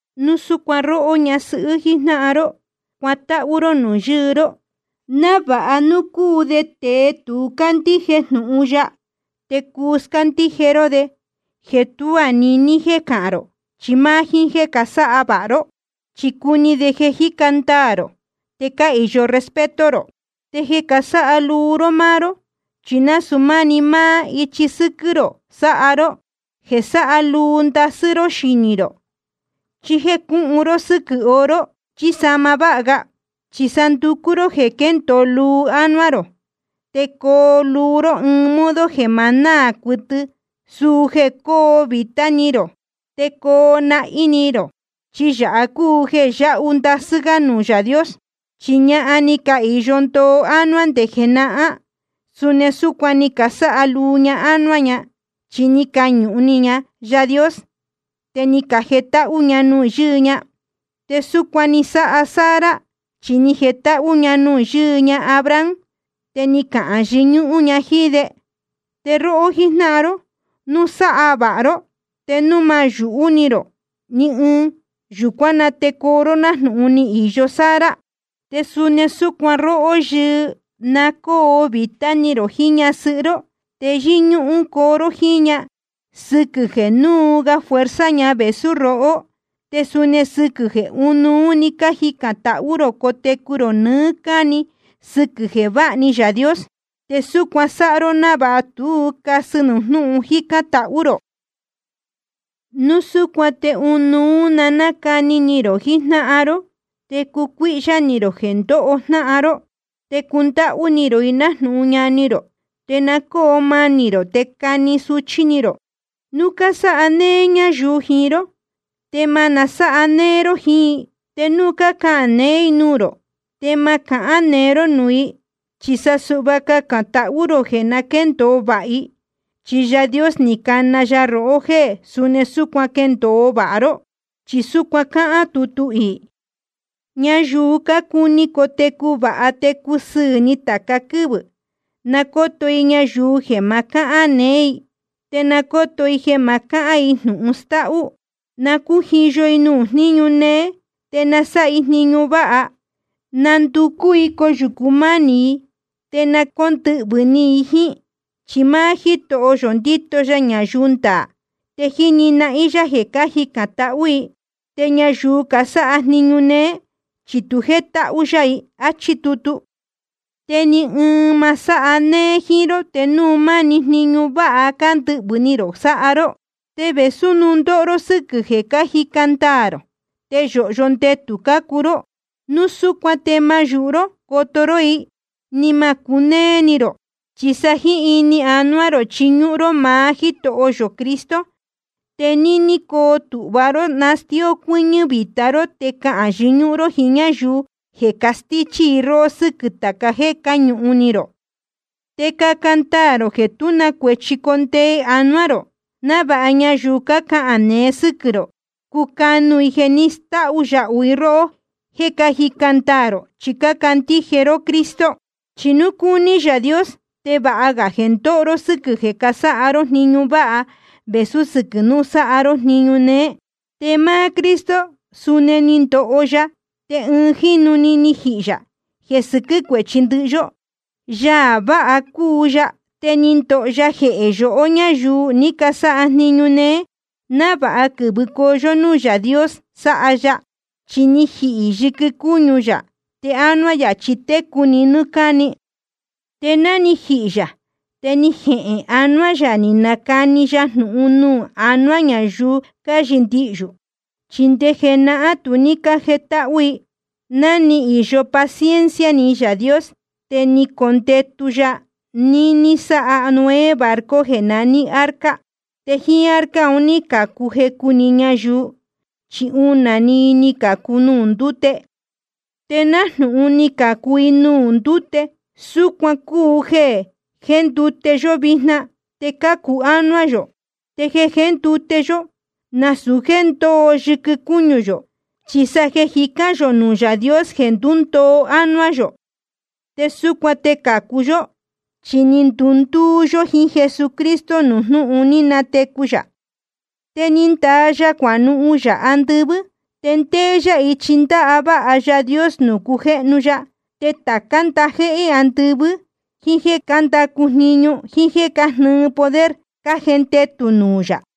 Suni súcuan róhó ñasɨhɨ́ jíjnáhan ró, cuatáhú ró nuū yɨɨ ró, návāha núu cúu de tēe tu cándíje jnūhun ya, te cuu scándíje ró de, jeē tuá niní jiín jéē cahán rō, chi máá jíín jéē casáha vāha ró. Chi cuni de jeē cájica ndaā rō te cáhīyo respeto rō. Te jeē casáha luu ró máá ró, chi nasūu máni máá ichi sɨ́quɨ́ rō sáha ró, jeē sáha luu ndasɨ́ ró xinī rō, chí jéē cúhun ró sɨ́quɨ̄ oro chí sahma váha ga. Chi sa nducú ró jeē quéndōo luu ánuá rō, te coo luu ró ɨɨn modo jeē ma náā cuɨtɨ, suu jeē cóo vītá ni rō te coo nahín ni rō. Chi yāha cúu jeē yahu ndasɨ́ gá nuū Yaā Dios. Chi ñahan ní cahīyo ndoo ánuá nde jenahán, suni súcuan ni casáha luu ña ánuá ña. Chi ni cañuhun ni ña Yaā Dios, te ni cajetáhú ña nuū yɨɨ ña. Te súcuan ni sáha Sara, chi ni jetáhú ña nuū yɨɨ ña Abraham, te ni cahān yɨñúhún ña jíín de. Te róhó jíjnáhan ró, núu sáha vāha ró te núu ma yūhu ró ni ɨɨn, yūcuán na te coo ró nájnūhun ni īyo Sara. Te suni súcuan róhó yɨɨ, na cóo vītá ni rō jiín ñasɨhɨ́ ró. Te yɨ́ñúhún coo ró jíín ña, sɨquɨ̄ jeē núu ga fuerza ña vēsú rohó, te suni sɨquɨ̄ jeē ɨnuú ní canihīn tahú rō cotecu rō nɨɨ́ cáni sɨquɨ̄ jeē váha ni Yaā Dios. Te súcuan sáha ró návāha tú casɨ nuū jnúhun jícán tahú rō. Núu súcuan te ɨnuú na cáni ni rō jijnáhan ró, te cucuíhyá ni rō jeē ndóho jnáhan ró, te cundáhú ni rō i nájnūhun ñani rō. Te na cóo manī rō te cani suchí ni rō. Núu cásáha néé ñáyuu jiín ró, te ma nasáha néé ró jiín i. Te núu cácahān neé i nuū rō, te ma nácahān neé ró núū i. Chi sa suhva cacān tahú rō jeē na quéndōo vāha i. Chi Yaā Dios ni cana ya rohó jéē suni súcuan quendōo vāha ró. Chi súcuan cáhán tutu iī: Ñayuu cácuni cotecu vāha te cusɨɨ̄ ni tāca quɨ́vɨ̄, na cóto i yuhu i jeē ma cáhán neé i, te na cóto i jeē ma cáhán i jnūhun stáhú. Na cújiyo i nuū jniñu néé, te na sáha i jniñu váha. Na ndúcú i coyūcu mánī i, te na cóndɨhvɨ̄ ni i jíín. Chi máá Jítoho yō ndíto ya ñayuu ndaā, te jíni nahín yá jeē cájicān tahú i. Te ñayuu casáha jniñu néé, chi tu jétáhú yá i. Achí tutu. Te ni ɨɨn ma sáha néé jíín ró te núu máni jniñu váha cándɨhvɨ̄ ni rō sáha ró. Te vēsú núu ndóho ró sɨ́quɨ̄ jeē cájica ndaā rō, te yōhyo ndetū cácuu ró. Núu súcuan te ma yūhu ró coto ró i, ni ma cunéé ni rō. Chi sa jíín ini jiín ánuá rō chiñúhún ró maá Jítoho yō Cristo. Te níní coo tūhva ró nastíó cuɨ́ñɨ́ vīta ró te cahān yɨñúhún ró jíín ñáyuu jeē castíchí rohó sɨ́quɨ̄ tāca jéē cáñuhun ni rō. Te caca ndaā rō jeē tú na cuēchi condee anuá rō, návāha ñayuu cácahān neé sɨ́quɨ̄ rō, cucanu i jeē ni stáú yáhu i róhó jéē cájica ndaā rō chi cácandíje ró Cristo. Chi núu cúní Yaā Dios te vāha ga jeē ndóho ró sɨ́quɨ̄ jeē casáha ró jniñu váha vēsú sɨquɨ̄ núu sáha ró jniñu néé. Chi máá Cristo suni ni ndoho ya, te ɨɨn jínu‑ni ni jihī yā jeē sɨquɨ́ cuéchi ndɨhɨ yó. Yaā vāha cúu ya, te ni ndoho ya jehē yohó ñáyuu ní casáha jniñu néé, návāha quɨ̄vɨcoo yó núū Yaā Dios sáha ya. Chi ni jihī yɨquɨ cúñu yā, te ánuá yā chi técu‑ni nɨ́ɨ́ cáni. Te ná ni jihī yā te ni jehēn anuá yā ni nacani ya jnūhun nuū anuá ñayuu cáyɨndihyū. Chi nde jenahán tu ní cájetáhú i, ná ni īyo paciencia ni Yaā Dios te ni condetu ya níní sáha Noé barco jeē naní arca. Te jíín arca un ní cācu jecu‑ni ñayuu, chi unā‑ni i ni cācu nuū ndúte. Te nájnūhun ni cacācu i nuū ndúte, súcuan cúu jeē jéndute yó vijna te cácu ánuá yō. Te jeē jéndute yó, nasūu jéē ndúndoo yɨquɨ cúñu yō, chi sa jeē jicán yō nuū Yaā Dios jeē ndúndoo ánuá yō. Te súcuan te cācu yó, chi ni cundúú yó jiín Jesucristo nuū jnúhun ni natecu yā. Te ni ndaa ya cuanuhun yā andɨvɨ́, te ndéé yá ichi ndáváha Yaā Dios nuū cujéhnu ya. Te tācá ndajéhé andɨvɨ́, jíín jéē cándacu jniñu, jíín jéē cájnɨɨ poder, cájendetū nuū yā.